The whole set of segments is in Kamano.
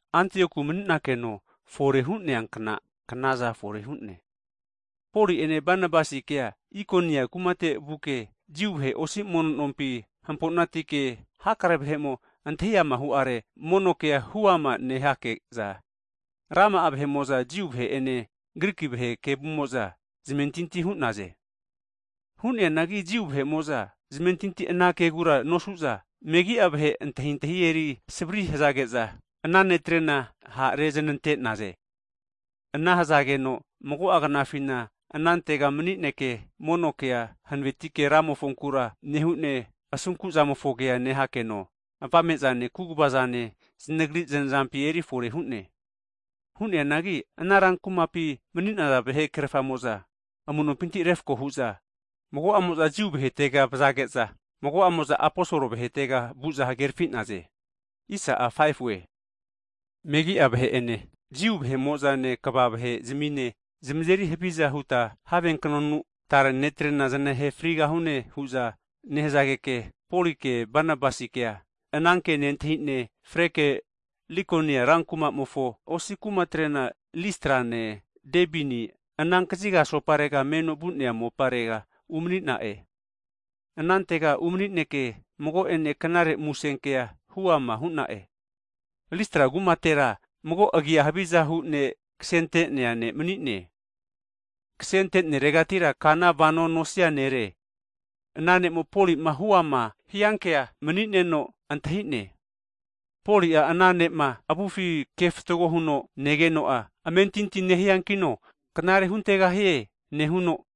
Antioku mani'nakeno fore hu'neankna kna'za fore hu'ne, Poli'ene Banabasikea Ikonia kumate vuke, Jiu vahe osi mono nompi (sinagog) hampo'natike hakare vahe'mo antahi ama hu'are, mono kea huama nehake'za, rama'amo'za Jiu vahe'ene Griki vahe kevumo'za zamentinti hu'naze. Hu'neanagi Jiu vahe'mo'za zamentinti ana kegura nosuza, megi'a vahe antahintahi eri savri hazage'za, ana netrena ha' rezanante'naze. Ana hazageno mago'a knafina anantega mani'neke, mono kea hanavetike Ramofonkura nehune, asunku'zamofo kea nehakeno, avame'zane kaguvazanena zanagri znazampi eri fore hu'ne. Hu'neanagi ana rankumapi mani'naza vahe krerafamo'za amu'nompinti refako hu'za, mago'amo'za Jiu vahetega vazage'za, mago'amo'za aposol vahetega anteza mago zamarimpa hu'naze. Megi'a vahe'ene Jiu vahe'mo'zane kva vahezamine, zamazeri haviza huta have knonu tare netrena zanahe frigahune hu'za nehazageke, Poli'ene Banabasikea ananke nentahi'ne, freke Likonia rankumamofo osi kumatrena Listrane Debine ana kaziga asoparega meno vu'nea mopare umani'na'e. Anantega umani'neke mago'ene Knare Musen Kea huama hu'ne zamasmi'na'e. Listra kumatera mago agia havizahu ne' kasente'nea ne' mani'ne, kasente'neregatira kana vano nosia nere. Ana ne'mo Poli'ma huama hiankea mani'neno antahi'ne. Poli'a ana ne'ma avufi kefatgo huno negeno'a, amentinti nehiankino knare huntegahie nehuno,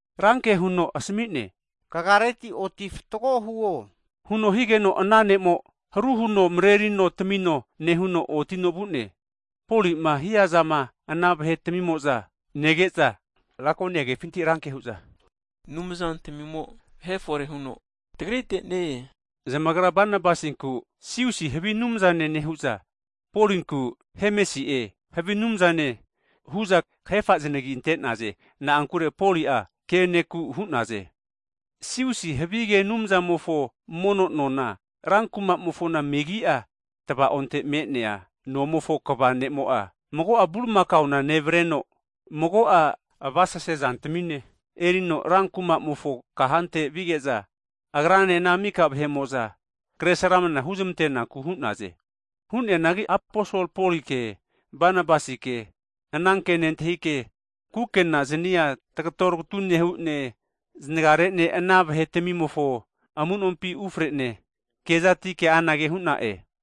ran ke huno asami'ne, Kagareti oti fatgo huo huno higeno, ana ne'mo'a, haru huno marerino tamino nehuno otino vu'ne. Poli'ma hiazama ana vahe tamimo'za nege'za, Lakonia kefinti ranke hu'za, anumzantamimo vahe fore huno tagrite ne-e hu'za hu'naze! Zamagra Banabasinku Ziusi (havi anumzane) nehu'za, Polinku Hemesi'e (havi anumzane) hu'za kahefa zanagi ante'naze. Na'ankure Poli'a ke ne'ku hu'naze. Ziusi havige anumzamofo mono nona, rankumamofona megi'a, tava'onte me'nea nomofo kva ne'mo'a, mago bulimakaona nevareno mago'a avasase zantamine erino rankumamofo kahante vige'za, agrane ana mika vahe'mo'za kresramana huznantenaku hu'naze. Hu'neanagi aposol Poli'ene Banabasikea ananke nentahike kukena zani'a tagato tagatu nehu'ne, zanagare'ne ana vahetamimofo amunompi ufre'ne kezatike anage hu'na'e.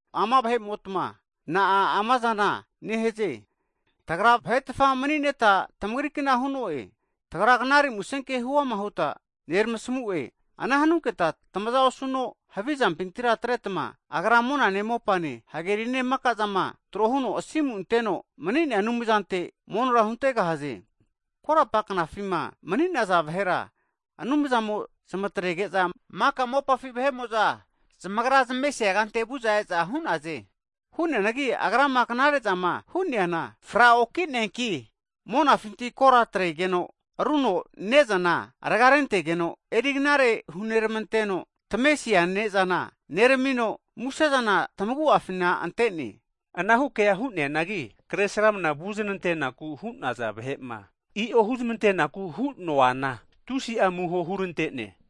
Ama vahe'motma, na'a amazana nehaze? tagra vahetafa mani'neta tamagri kna hu'no'e! Tagra Knare Musenke huama huta neramasmu'e, ana hanuketa tamazama osuno havi zampintira atretma, Agra monane mopane, hagerine maka'zama tro huno asimu anteno mani'nea Anumzante monora huntegahaze. Hagi korapa knafima mani'naza vahera, Anumzamo'a zamatrege'za maka mopafi vahe'mo'za zamagra zamesia kante vu'za e'za hu'naze. Hu'neanagi Agrama knare'zama hu'neana fraoki'neanki, monafinti kora atregeno rigeno ne'za raga rentegeno, eri knare hunermanteno tamesia ne'zana neramino, musezana tamagu'afina ante'ne. Anahu kea hu'neanagi kresramna vuznantenaku hu'nazana vahe'ma i'o huzmantenaku hu'noanagi, tusi'a amuho huzmante'ne.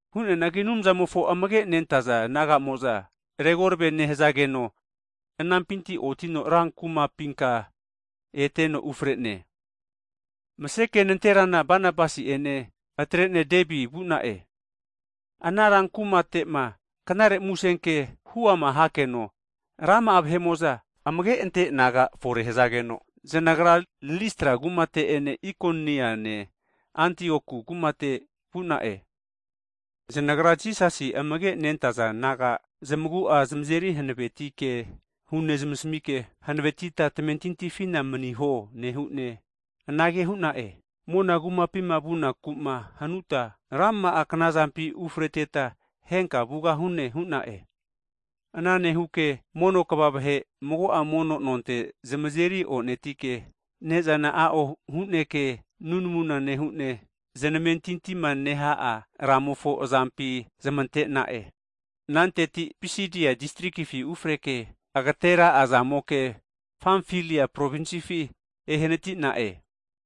Hu'neanagi Anumzamofo amage nentaza disaipol naga'mo'za, regorave nehazageno anampinti otino ran kumapinka eteno ufarene. Maseke nanterana Banabasi'ene atre'ne Debi vu'na'e. Ana ran kumate'ma knare muse ke (gutnius) huama hakeno rama'a vahe'mo'za, amage ante'za disaipol naga fore hazageno, zanagra Listra kumate'ene Ikoniane Antioku kumate ete vu'na'e. Zanagra Jisasi amage' nentaza disaipol naga zamagu'a zamazeri hanaveti ke hunezmasmike, hanavetita tamentintifina maniho, Anumzamofo kumapima vunaku'ma hanuta, rama'a knazampi ufreteta henka vugahune hu'na'e. Ana nehuke, mono kva vahe (elda) mago'a mono nonte zamazeri onetike ne'zana a'o huneke nunamu nehune, zanamentintima neha'a Ramofo azampi zamante'na'e. Ananteti Pisidi'a distrikifi ufreke agatera'azamoke, Pamfilia provinsifi ehanati'na'e.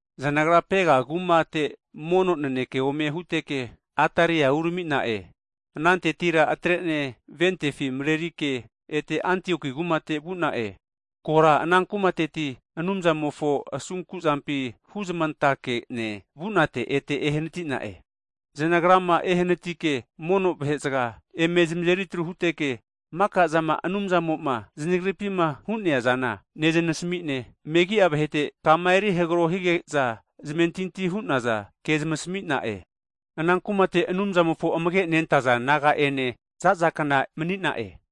Zanagra Pega kumate mono naneke ome huteke, Ataria kumate urami'na'e. Anantetira atre'ne ventefi marerike ete Antioku kumate vu'na'e, korapara ana kumateti Anumzamofo asunkuzampi huzamantake'ne vunate ete ehanatina'e. Zanagrama ehanatike mono vahezaga eme zamazeri atru huteke, maka'zama Anumzamo'ma zanagripima hu'neazana nezamasmi'ne, megi'a vahete kama eri hagro hige'za zamentinti hu'naza kea zamasmi'na'e. Ana kumate Anumzamofo amage' nentaza disaipol naga'ene zazakna mani'na'e.